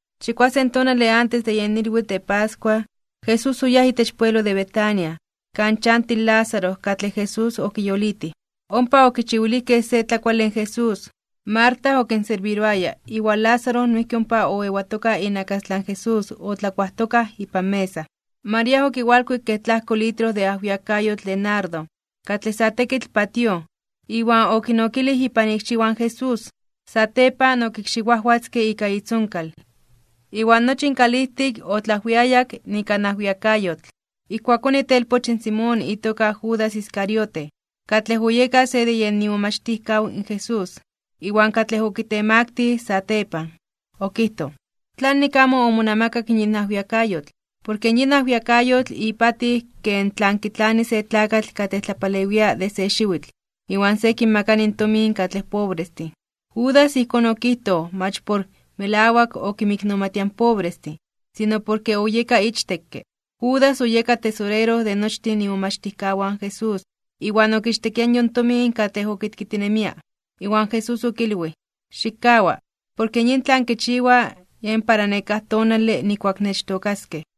Chikuasen tonale antes de yen ilwitl de pascua, Jesús oyáj itech pueblo de Betania, kan chanti in Lázaro katlej Jesús okiyolitij. Ompa okichiwilijkej se tlakuale in Jesús. Marta okinserbiroaya, iwan Lázaro noijki ompa oewatoka inakastlan Jesús otlakuajtokaj ipan mesa. María okiwalkuik kej tlajko litro de ajwiakayotl de nardo, katlej sa tekitl patíoj, iwan okinokilij ipan ikxiwan in Jesús. Satepan okikxiwajwatzke ika itzonkal, iwan nochi in kalijtik otlaajwiayak ika in ajwiakayotl. Ijkuakón itelpoch in Simón itoka Judas Iscariote, katlej oyeka se de yen imomachtijkaw in Jesús, iwan katlej okitemaktij (okitemaktilij) satepan, okijtoj: ―¿Tlanik amo omonamakak yin ajwiakayotl? Porke yin ajwiakayotl ipatij ken tlan kitlani se tlakatl katlej tlapalewia de se xiwitl, iwan se kinmakani in tomin katlej pobrestin. Judas ijkón okijtoj mach por melawak okinmiknomatia in pobrestin, sino porke oyeka ichtekke. Judas oyeka tesorero de nochtin imomachtijkawan in Jesús, iwan okichtekia yon tomin katlej okitkitinemia. Iwan Jesús okilwij: ―Xikkawa. Porke yin tlan kichiwa, yen para nekáj tonale nijkuak nechtookaskej.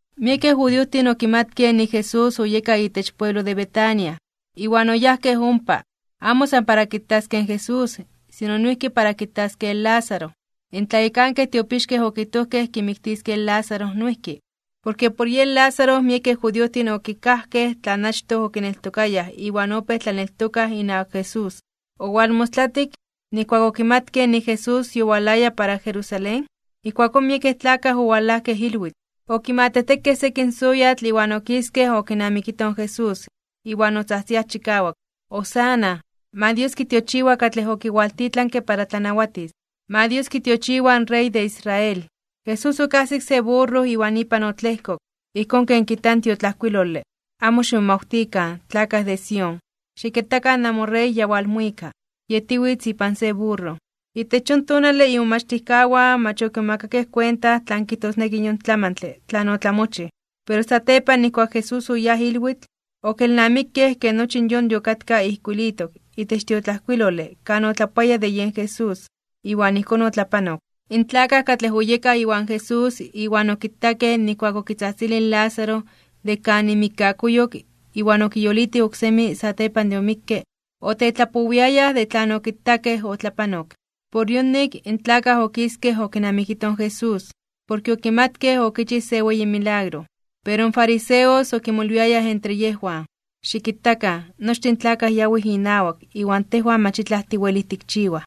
Miekej judiojtin okimatkej nik in Jesús oyeka itech pueblo de Betania, iwan oyajkej ompa, amo san para kitaskej in Jesús sino noijki para kitaskej in Lázaro. In tlayekankej tiopixkej okijtojkej kimiktiskej in Lázaro noijki. Porke por yen Lázaro miekej judiojtin okikajkej tlan achtoj okineltokayaj iwan opéj tlaneltokaj inawak Jesús. Owalmostlatik, nijkuak okimatkej nik in Jesús yowalaya para Jerusalén, ijkuakón miekej tlakaj owalajkej ilwitl. Okimatejtekej sekin soyatl iwan okiskej okinamikitoj in Jesús, iwan otzajtziaj chikawak: ―¡Hosana! ¡Ma Dios kitiochiwa katlej okiwaltitlanke para tlanawatis! ¡Ma Dios kitiochiwa in Rey de Israel! Jesús okajsik se burro iwan ipan otlejkok, ijkón ken kijta in tiotlajkuilole: Amo ximomawtikan, tlakaj de Sión. Xikitakan namoRey ya walmuika. Yetiwitz ipan se burro. Itech yon tonale imomachtijkawan mach okimomakakej kuenta tlan kijtosneki yon tlamantle tlan otlamochij. Pero satepan nijkuak in Jesús oyáj ilwikak, okelnamikej ke nochi yon yokatka ijkuilitok itech tiotlajkuilole kan otlapoaya de yen Jesús, iwan ijkón otlapanok. In tlakaj katlej oyekaj iwan Jesús iwan okitakej nijkuak okitzajtzilij in Lázaro de kan imikkakuyok iwan okiyolitij oksemi satepan de omikke, otetlapowiayaj de tlan okitakej otlapanok. Por yonik, in tlakaj okiskej okinamikitoj in Jesús, porke okimatkej okichij se weyi milagro. Pero in fariseos okimolwiayaj entre yejwan: ―Xikitakan, nochtin in tlakaj yawij inawak iwan tejwan mach itlaj tiwelij tikchiwaj.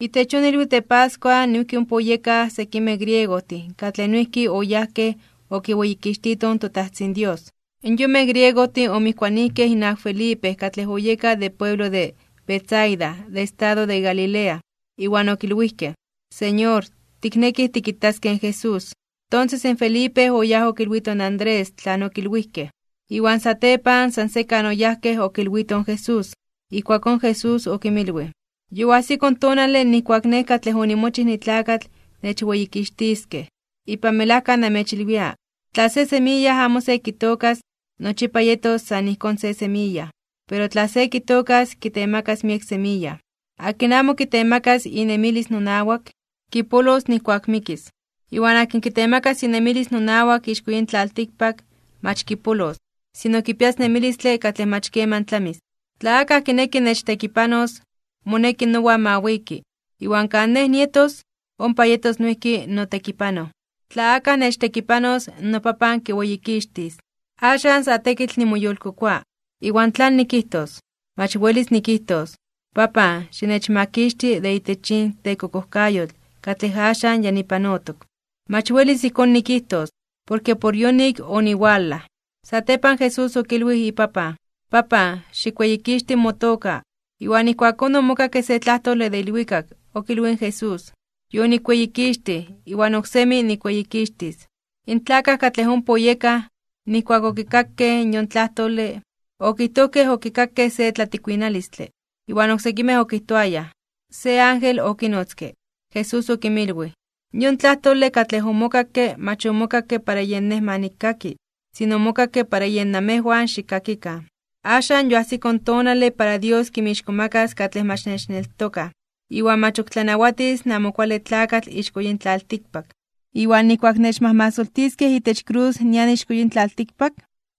Itech yon ilwitl de pascua noijki ompa oyekaj sekimej griegojtin katlej noijki oyajkej okiweyikixtitoj in toTajtzin Dios. Yonmej griegojtin omijkuanijkej inawak Felipe katlej oyeka de pueblo de Betsaida de estado de Galilea. Iwan okilwijkej: ―Señor, tiknekij tikitaskej in Jesús. Tonses in Felipe oyáj okilwito in Andrés tlan okilwijkej. Iwan satepan san sekan oyajkej okilwitoj in Jesús. Ijkuakón Jesús okinmilwij: ―Yoajsiko in tonale nijkuak in Nej katlej onimochij nitlakatl nechweyikixtiskej. Ipan melajka namechilwia, tla se semiya amo se kitookas, nochipa yetos san ijkón se semiya. Pero tla se kitookas kitemakas miek semiya. Akin amo kitemakas inemilis nonawak, kipolos nijkuak mikis. Iwan akin kitemakas inemilis nonawak ixko yin tlaltikpak, mach kipolos, sino kipias nemilistle katlej mach keman tlamis. Tla akaj kineki nechtekipanos, moneki nowan ma wiki. Iwan kan Nej nietos, ompa yetos noijki notekipanoj. Tla akaj nechtekipanos, noPapan kiweyikixtis. ’Axan sa tekitl nimoyolkokoa. ¿Iwan tlan nikijtos? Mach welis nikijtos: “Papan, xinechmakixti de itech yin tekokojkayotl katlej axan ya nipanotok.” Mach welis ijkón nikijtos, porke por yonik oniwalaj. Satepan Jesús okilwij iPapan: ―Papan, xikweyikixti motoka. Iwan ijkuakón omokakke se tlajtole de ilwikak, okilwij in Jesús: ―Yonikweyikixtij iwan oksemi nikweyikixtis. In tlakaj katlej ompa oyekaj, nijkuak okikakej in yon tlajtole, okijtojkej okikakej se tlatikuinalistle. Iwan oksekimej okijtoayaj: ―Se ángel okinotzke. Jesús okinmilwij: ―Yon tlajtole katlej omokakke mach omokakke para yen Nej ma nikkaki, sino omokakke para yen namejwan xikkakikan. Axan yoajsiko tonale para Dios kinmixkomakas (kintzonmanas) katlej mach nechneltokaj, iwan mach ok tlanawatis in Amo Kuale Tlakatl ixko yin tlaltikpak. Iwan nijkuak nechmajmasoltiskej itech krus nian ixko yin tlaltikpak,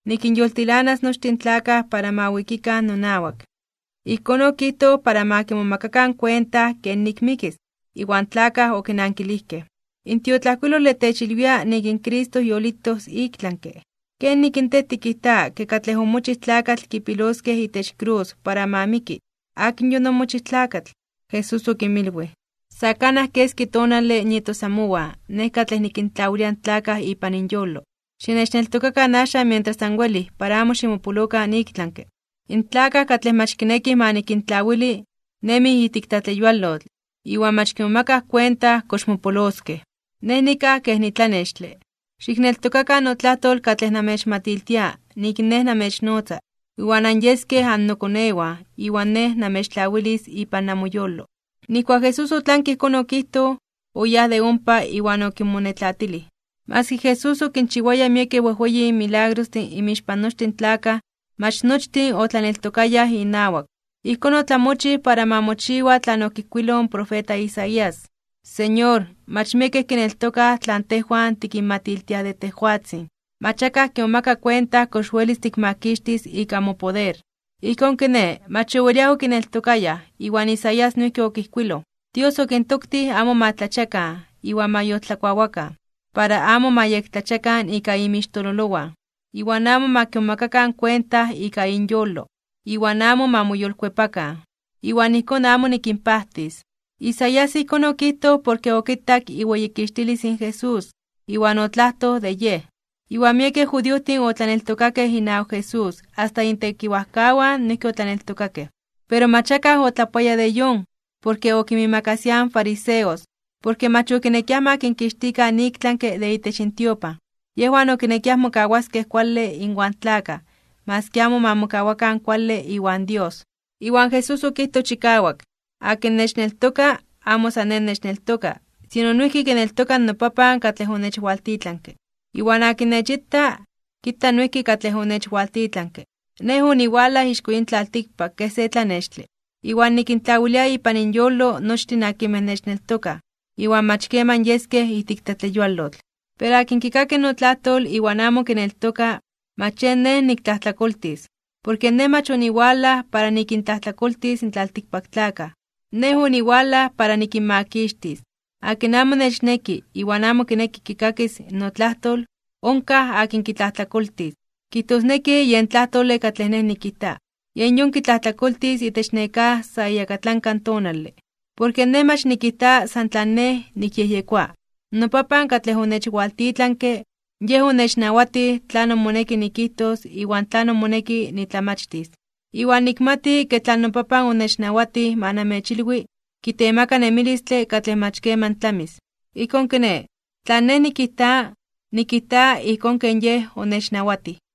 nikinyoltilanas nochtin in tlakaj para ma wikikan nonawak. Ijkón okijtoj para ma kimomakakan kuenta kenik mikis. Iwan tlakaj okinankilijkej: ―In tiotlajkuilole techilwia nik in Cristo yolitos iktlanke (ik tlami). ¿Kenik in Tej tikijta ke katlej omochij tlakatl kipiloskej itech krus para ma miki? ¿Akin yon omochij tlakatl? Jesús okinmilwij: ―Sa kanaj keski tonale nietos amowan Nej katlej nikintlawilia in tlakaj ipan inyolo. Xinechneltokakan axan mientras anwelij para amo ximopolokan iktlanke (ik tlami). In tlakaj katlej mach kinekij ma nikintlawili, nemij ijtik tlatleyualotl iwan mach kimomakaj kuenta kox mopoloskej. Nej nikaj kej nitlanextle. Xikneltokakan notlajtol katlej namechmatiltia nik Nej namechnotza, iwan anyeskej annokonewan iwan Nej namechtlawilis ipan namoyolo. Nijkuak in Jesús otlanke ijkón okijtoj, oyáj de ompa iwan okinmonetlatilij. Maski Jesús okinchiwaya miekej wejweyin milagrostin inmixpan nochtin tlakaj, mach nochtin otlaneltokayaj inawak. Ijkón otlamochij para ma mochiwa tlan okijkuiloj in profeta Isaías: Señor, mach miekej kineltokaj tlan tejwan tikinmatiltiaj de tejwatzin. Mach akaj kimomaka kuenta kox welis tikmakixtis ika mopoder. Ijkón kiné, mach oweliaj okineltokayaj, iwan in Isaías noijki okijkuiloj: Dios okintoktij amo ma tlachiakan iwan ma yoltlakuawakan, para amo ma yektlachiakan ika inmixtololowan, iwan amo ma kimomakakan kuenta ika inyolo, iwan amo ma moyolkuepakan, iwan ijkón amo nikinpajtis. Isaías ijkón okijtoj porke okitak iweyikixtilis in Jesús, iwan otlajtoj de Yej. Iwan miekej judiojtin otlaneltokakej inawak Jesús, asta intekiwajkawan noijki otlaneltokakej, pero mach akaj otlapoaya de yon, porke okinmiimakasiaj in fariseos, porke mach okinekiaj ma kinkixtikan iktlanke (ik tlami) de itech intiopan. Yejwan okinekiaj mokawaskej kuale inwan tlakaj maski amo ma mokawakan kuale iwan Dios. Iwan Jesús okijtoj chikawak: ―Akin nechneltoka, amo san Nej nechneltoka, sino noijki kineltoka in noPapan katlej onechwaltitlanke. Iwan akin nechita, kita noijki katlej onechwaltitlanke. Nej oniwalaj ixko yin tlaltikpak kej se tlanextle. Iwan nikintlawilia ipan inyolo nochtin akinmej nechneltokaj, iwan mach keman yeskej ijtik tlatleyualotl. Pero akin kikaki notlajtol iwan amo kineltoka, mach yen Nej niktlajtlakoltis. Porke Nej mach oniwalaj para nikintlajtlakoltis in tlaltikpaktlakaj, Nej oniwalaj para nikinmakixtis. Akin amo nechneki iwan amo kineki kikakis notlajtol, onkaj akin kitlajtlakoltis. Kijtosneki yen tlajtole katlej Nej nikijta, yen yon kitlajtlakoltis itech nekáj sa iyakatlanka tonale. Porke Nej mach nikijta san tlan Nej nikyejyekoa. NoPapan katlej onechwaltitlanke, Yej onechnawatij tlanon moneki nikijtos iwan tlanon moneki nitlamachtis. Iwan nikmati ke tlan noPapan onechnawatij ma namechilwi, kitemaka nemilistle katlej mach keman tlamis. Ijkón kiné, tlan Nej nikijta, nikijta ijkón ken Yej onechnawatij.